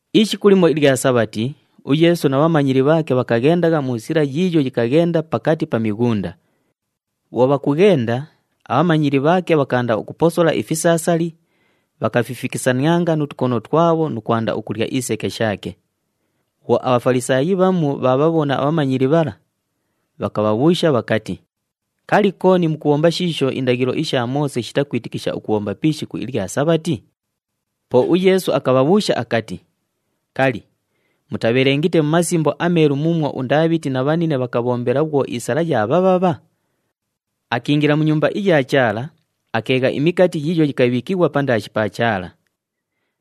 Ishiku limo ilya Sabhati, uYeesu na bhamanyili bhaake bhakaghendagha mu sila yiiyo yikaghenda pakati pa mighunda. Bhwo bhakughenda, abhamanyili bhaake bhakaanda ukuposola ifisaasali, bhakafifikisanianga nu tukono twabho nu kwanda ukulya iseke shaake. Bhwo aBhafalisaayi bhamu bhaabhabhona abhamanyili bhala, bhakabhabhuusha bhakati, “Kali, kooni mukubhomba shiisho indaghilo isha Moose shitakwitikisha ukubhomba pi ishiku ilya Sabhati?” Po uYeesu akabhabhuusha akati, “Kali, mutabhelengite mu Masimbo aMeelu muumwo uNdaabhiti na bhanine bhakabhombela bhwo isala yaabhabhabha? Akiingila mu Nyumba iya Chaala, akeegha imikati yiiyo yikabhiikighwa pandaashi pa Chaala.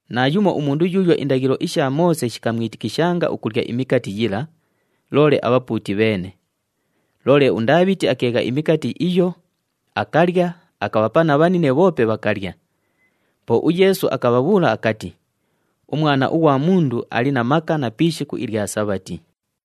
Naayumo umundu yuuyo indaghilo isha Moose shikamwitikishanga ukulya imikati yila, loole abhapuuti bheene. Loole uNdaabhiti akeegha imikati iyo, akalya, akabhapa na bhanine bhoope bhakalya.” Po uYeesu akabhabhuula akati, “UMwana ughwa Mundu ali na maka na pi ishiku ilya Sabhati.”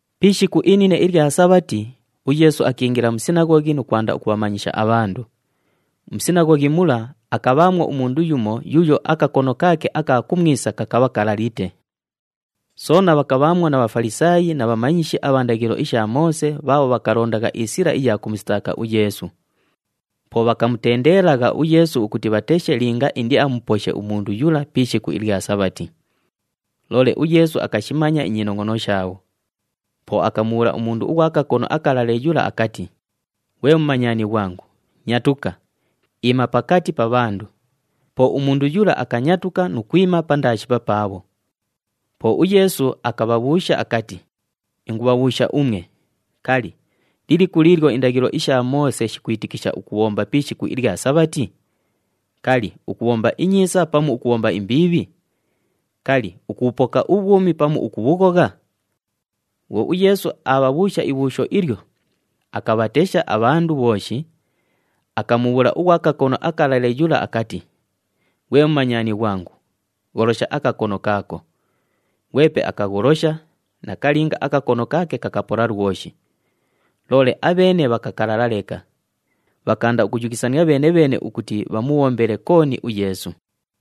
Pi ishiku inine ilya Sabhati, uYeesu akiingila mu sinaghoghi nu kwanda ukubhamanyisha abhandu. Mu sinaghoghi mula, akabhaamwo umundu yumo yuuyo akakono kaake aka kumwisa kakabha kalalite. Soona bhakabhaamwo na Bhafalisaayi na bhamanyishi abha ndaghilo isha Moose bhaabho bhakalondagha isila iya kumusitaaka uYeesu. Po bhakamutendeelagha uYeesu ukuti bhateshe linga indiamuposhe umundu yula pi ishiku ilya Sabhati. Loole uYeesu akashimanya inyinongʼono shaabho. Po akamubhuula umundu ughwa kakono akalale yula akati, “Ghwe mumanyani ghwangu, nyatuka, iima pakati pa bhandu.” Po umundu yula akanyatuka nu kwima pandaashi papaabho. Po uYeesu akabhabhuusha akati, “Ingubhabhuusha umwe, kali, liliku liilyo indaghilo isha Moose shikwitikisha ukubhomba pi ishiku ilya Sabhati? Kali, ukubhomba inyiisa pamu ukubhomba imbiibhi? Kali, ukubhupoka ubhwumi pamu ukubhughogha?” Bhwo uYeesu aabhabhuusha ibhuusho ilyo, akabhatesha abhandu bhooshi, akamubhuula ughwa kakono akalale yula akati, “Ghwe mumanyani ghwangu, gholosha akakono kaako.” Ghwepe akagholosha, nakalinga akakono kaake kakapola lwoshi. Loole abheene bhakakalala leka, bhakaanda ukuyughisania bheene-bheene ukuti bhamubhombele kooni uYeesu.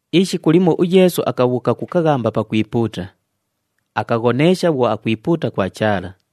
Ishiku limo uYeesu akabhuuka ku kaghamba pakwipuuta. Akaghoneesha bhwo akwipuuta kwa Chaala.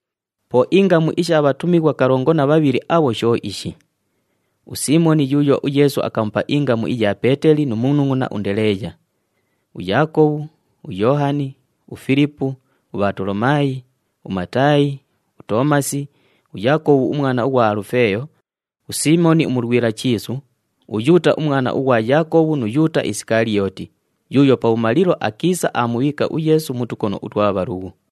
Po ingamu isha bhatumighwa kalongo na bhabhili abho sho ishi, uSiimoni yuuyo uYeesu akamupa ingamu iya Peeteli nu munungʼuna uNdeleeya, uYaakobhu, uYoohani, uFilipu, uBhatolomaayi, uMataayi, uToomasi, uYaakobhu umwana ughwa Alufeeyo, uSiimoni uMulwila Chiisu, uYuuta umwana ughwa Yaakobhu nu Yuuta Isikaliyooti, yuuyo pabhumalilo akiisa aamubhiika uYeesu mu tukono utwa bhalughu.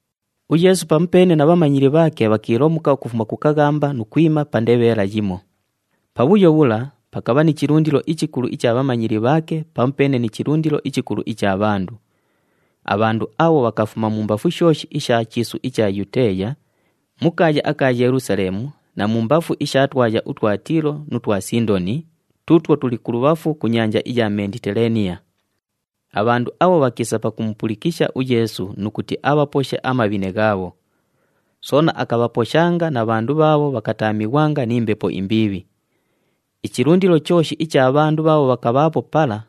UYeesu pamupeene na bhamanyili bhaake bhakiilomuka ukufuma ku kaghamba nu kwima pa ndebheela yimo. Pabhuyo bhula pakabha ni chilundilo ichikulu icha bhamanyili bhaake pamupeene ni chilundilo ichikulu icha bhandu. Abhandu abho bhakafuma mumbafu shooshi isha chiisu icha Yuteeya, mu kaaya aka Yelusaleemu na mumbafu isha twaya utwa Tiilo nu twa Sindoni tuutwo tuli kulubhafu ku nyanja iya Menditelaaniya. Abhandu abho bhakiisa pakumupulikisha uYeesu nu kuti abhaposhe amabhine ghaabho. Soona akabhaposhanga na bhandu bhaabho bhakataamighwanga ni mbepo imbiibhi. Ichilundilo chooshi icha bhandu bhaabho bhakabhaapo pala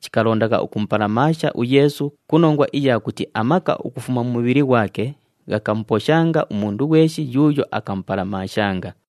chikalondagha ukumupalamaasha uYeesu ku nongwa iya kuti amaka ukufuma mu mubhili ghwake ghakamuposhanga umundu ghweshi yuuyo akamupalamaashanga.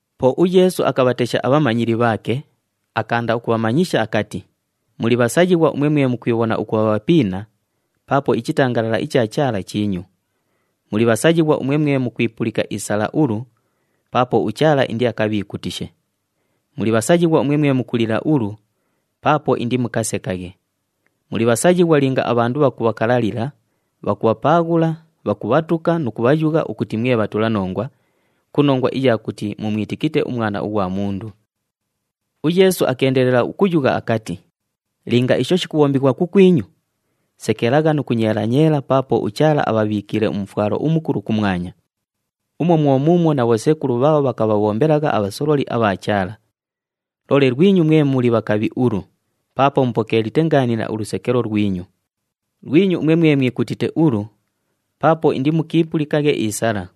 Po uYeesu akabhatesha abhamanyili bhaake, akaanda ukubhamanyisha akati, “Muli bhasayighwa umwe mwe mukwibhona ukubha bhapiina, paapo ichitangalala icha Chaala chiinyu. Muli bhasayighwa umwe mwe mukwipulika isala ulu, paapo uChaala indiakabhiikutishe. Muli bhasayighwa umwe mwe mukulila ulu, paapo indimukasekaghe. Muli bhasayighwa linga abhandu bhakubhakalalila, bhakubhapaaghula, bhakubhatuka nu kubhayugha ukuti mwe bhatulanongwa, ku nongwa iya kuti mumwitikite uMwana ughwa Mundu.” UYeesu akeendelela ukuyugha akati, “Linga isho shikubhombighwa kukwinyu, sekelagha nu kunyeela-nyeela paapo uChaala abhabhiikiile umufwalo umukulu kumwanya. Umwo mwo muumwo na bhosekulu bhaabho, bhakabhabhombelagha abhasololi abha Chaala. Loole lwinyu umwe mwe muli bhakabhi ulu, paapo mupokeelite ngaanila ulusekelo lwinyu. Lwinyu umwe mwe mwikutite ulu, paapo indimukiipulikaghe isala.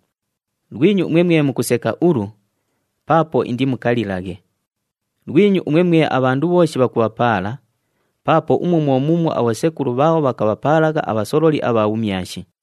Lwinyu umwe mwe mukuseka ulu, paapo indimukalilaghe. Lwinyu umwe mwe abhandu bhooshi bhakubhapaala, paapo umwo mwo muumwo abhosekulu bhaabho, bhakabhapaalagha abhasololi abha bhumyashi.”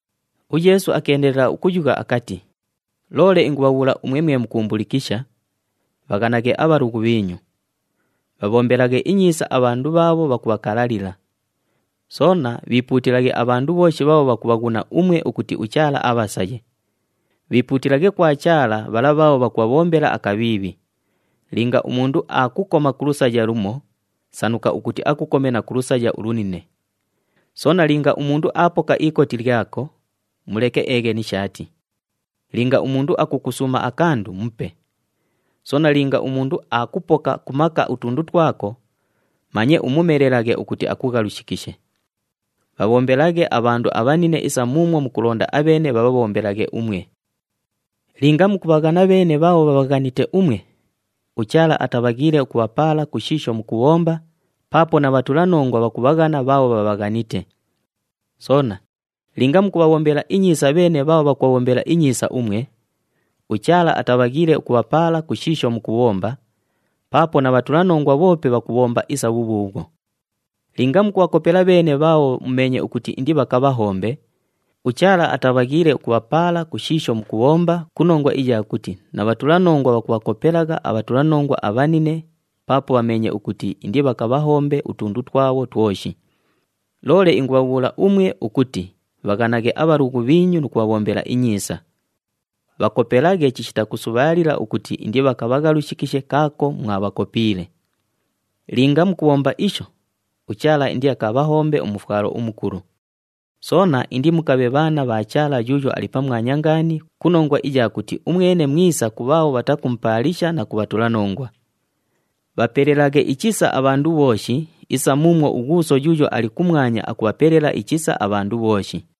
UYeesu akeendelela ukuyugha akati, “Loole ingubhabhuula umwe mwe mukuumbulikisha, bhaghanaghe abhalughu bhiinyu. Bhabhombelaghe inyiisa abhandu bhaabho bhakubhakalalila. Soona bhiipuutilaghe abhandu bhooshi bhaabho bhakubhaghuna umwe ukuti uChaala abhasaye. Bhiipuutilaghe kwa Chaala bhala bhaabho bhakubhabhombela akabhiibhi. Linga umundu aakukoma ku lusaya lumo, sanuka ukuti akukome na ku lusaya ulunine. Soona linga umundu aapoka ikoti lyako, muleke eeghe ni shaati. Linga umundu akukusuuma akandu, mupe. Soona linga umundu aapoka ku maka utundu twako, manye umumelelaghe ukuti akughalushikishe. Bhabhombelaghe abhandu abhanine isa muumwo mukulonda abheene bhabhabhombelaghe umwe. “Linga mukubhaghana bheene bhaabho bhabhaghanite umwe, uChaala atabhaghiile ukubhapaala ku shiisho mukubhomba, paapo na bhatulanongwa bhakubhaghana bhaabho bhabhaghanite. Soona linga mukubhabhombela inyiisa bheene bhaabho bhakubhabhombela inyiisa umwe, uChaala atabhaghiile ukubhapaala ku shiisho mukubhomba, paapo na bhatulanongwa bhoope bhakubhomba isa bhubhuubhwo. Linga mukubhakopela bheene bhaabho mumeenye ukuti indibhakabhahombe, uChaala atabhaghiile ukubhapaala ku shiisho mukubhomba ku nongwa iya kuti na bhatulanongwa bhakubhakopelagha abhatulanongwa abhanine, paapo bhameenye ukuti indibhakabhahombe utundu twabho twoshi. Loole ingubhabhuula umwe ukuti bhaghanaghe abhalughu bhiinyu nu kubhabhombela inyiisa. Bhakopelaghe chishita kusubhaalila ukuti indibhakabhaghalushikishe kaako mwabhakopiile. Linga mukubhomba isho, uChaala indiakabhahombe umufwalo umukulu. Soona indimukabhe bhaana bha Chaala Yuuyo Ali Pamwanya Ngaani ku nongwa iya kuti umwene mwisa ku bhaabho bhatakumupaalisha na ku bhatulanongwa. Bhapelelaghe ichisa abhandu bhooshi isa muumwo uGhuuso yuuyo ali kumwanya akubhapelela ichisa abhandu bhooshi.”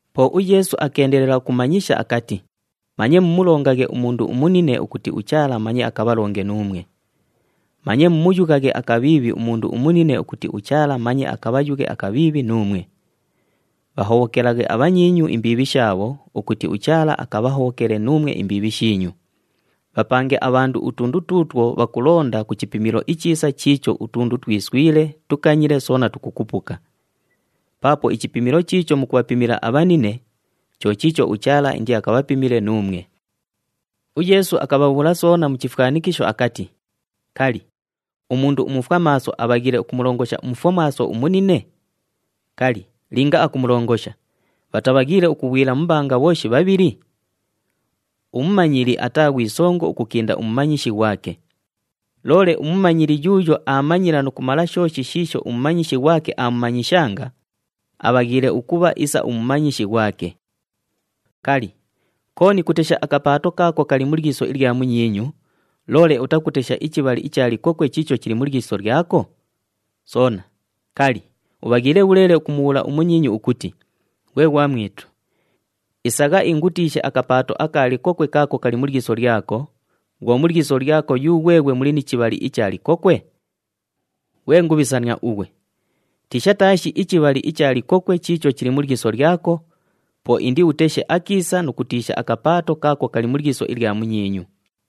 Po uYeesu akeendelela ukumanyisha akati, “Manye mumulongaghe umundu umunine ukuti uChaala manye akabhalonge nuumwe. Manye mumuyughaghe akabhiibhi umundu umunine ukuti uChaala manye akabhayughe akabhiibhi nuumwe. Bhahobhokelaghe abhanyiinyu imbiibhi shaabho ukuti uChaala akabhahobhokele nuumwe imbiibhi shiinyu. Bhapange abhandu utundu tuutwo bhakulonda ku chipimilo ichiisa chiicho utundu twiswile, tukanyile soona tukukupuka. Paapo ichipimilo chiicho mukubhapimila abhanine, cho chiicho uChaala indiakabhapimile nuumwe.” UYeesu akabhabhuula soona mu chifwanikisho akati, “Kali, umundu umufwamaaso abhaghiile ukumulongosha umufwamaaso umunine? Kali, linga akumulongosha, bhatabhaghiile ukughwila mu mbanga bhooshi bhabhili? Umumanyili ataa ghwi songo ukukinda umumanyishi ghwake. Loole umumanyili yuuyo aamanyila nu kumala shooshi shiisho umumanyishi ghwake aamumanyishanga, abhaghiile ukubha isa umumanyishi ghwake. “Kali, kooni kutesha akapaato kaako kali mu lyiso ilya munyiinyu, loole utakutesha ichibhali icha likokwe chiicho chili mu lyiso lyako? Soona, kali, ubhaghiile bhuleele ukumubhuula umunyiinyu ukuti, ‘Ghwe ghwamwitu, isagha ingutiishe akapaato aka likokwe kaako kali mu lyiso lyako,’ bhwo mu lyiso lyako yughweghwe muli ni chibhali icha likokwe? Ghwe ngubhisania ughwe! Tiisha taashi ichibhali icha likokwe chiicho chili mu lyiso lyako, po indiuteshe akiisa nu kutiisha akapaato kaako kali mu lyiso ilya munyiinyu.”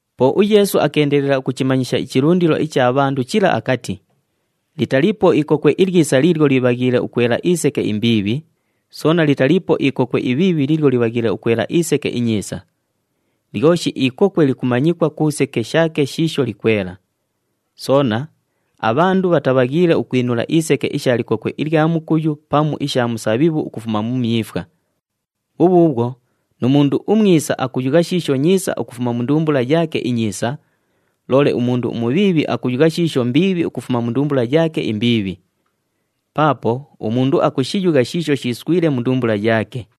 Po uYeesu akeendelela ukuchimanyisha ichilundilo icha bhandu chila akati, “Litaliipo ikokwe ilyisa liilyo libhaghiile ukwela iseke imbiibhi, soona litaliipo ikokwe ibhiibhi liilyo libhaghiile ukwela iseke inyiisa. Lyoshi ikokwe likumanyikwa ku seke shaake shiisho likwela. Soona, abhandu bhatabhaghiile ukwinula iseke isha likokwe ilya mukuyu pamu isha musabhibhu ukufuma mu myifwa. Bhubhuubhwo nu mundu umwisa akuyugha shiisho nyiisa ukufuma mu ndumbula yaake inyiisa, loole umundu umubhiibhi akuyugha shiisho mbiibhi ukufuma mu ndumbula yaake imbiibhi. Paapo umundu akushiyugha shiisho shiiswile mu ndumbula yaake.”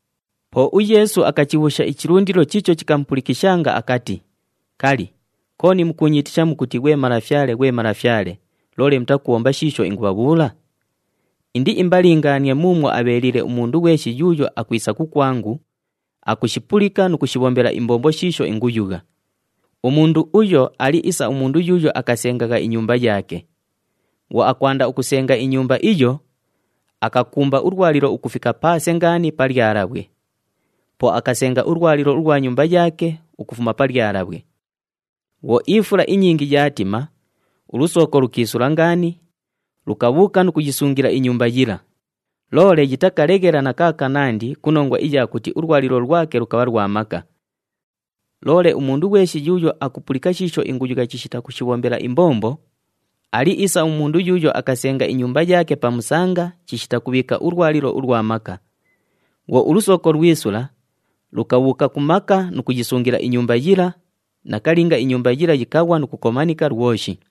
Po uYeesu akachibhuusha ichilundilo chiicho chikamupulikishanga akati, “Kali, kooni mukuunyiitisha mukuti, ‘Ghwe Malafyale, ghwe Malafyale,’ loole mutakubhomba shiisho ingubhabhuula? Indiimbalingaanie muumwo abheeliile umundu ghweshi yuuyo akwisa kukwangu, akushipulika nu kushibhombela imbombo shiisho inguyugha. Umundu uyo ali isa umundu yuuyo akasengagha inyumba yaake. Bhwo akwanda ukusenga inyumba iyo, akakumba ulwalilo ukufika paase ngaani pa lyalabhwe. Po akasenga ulwalilo ulwa nyumba yaake ukufuma pa lyalabhwe. Bhwo ifula inyingi yaatima, ulusooko lukiisula ngaani, lukabhuuka nu kuyisungila inyumba yila, loole yitakaleghela na kaakanandi ku nongwa iya kuti ulwalilo lwake lukabha lwa maka. Loole umundu ghweshi yuuyo akupulika shiisho inguyugha chishita kushibhombela imbombo, ali isa umundu yuuyo akasenga inyumba yaake pa musanga chishita kubhiika ulwalilo ulwa maka. Bhwo ulusooko lwisula, lukabhuuka ku maka nu kuyisungila inyumba yila, nakalinga inyumba yila yikaghwa nu kukomanika lwoshi.”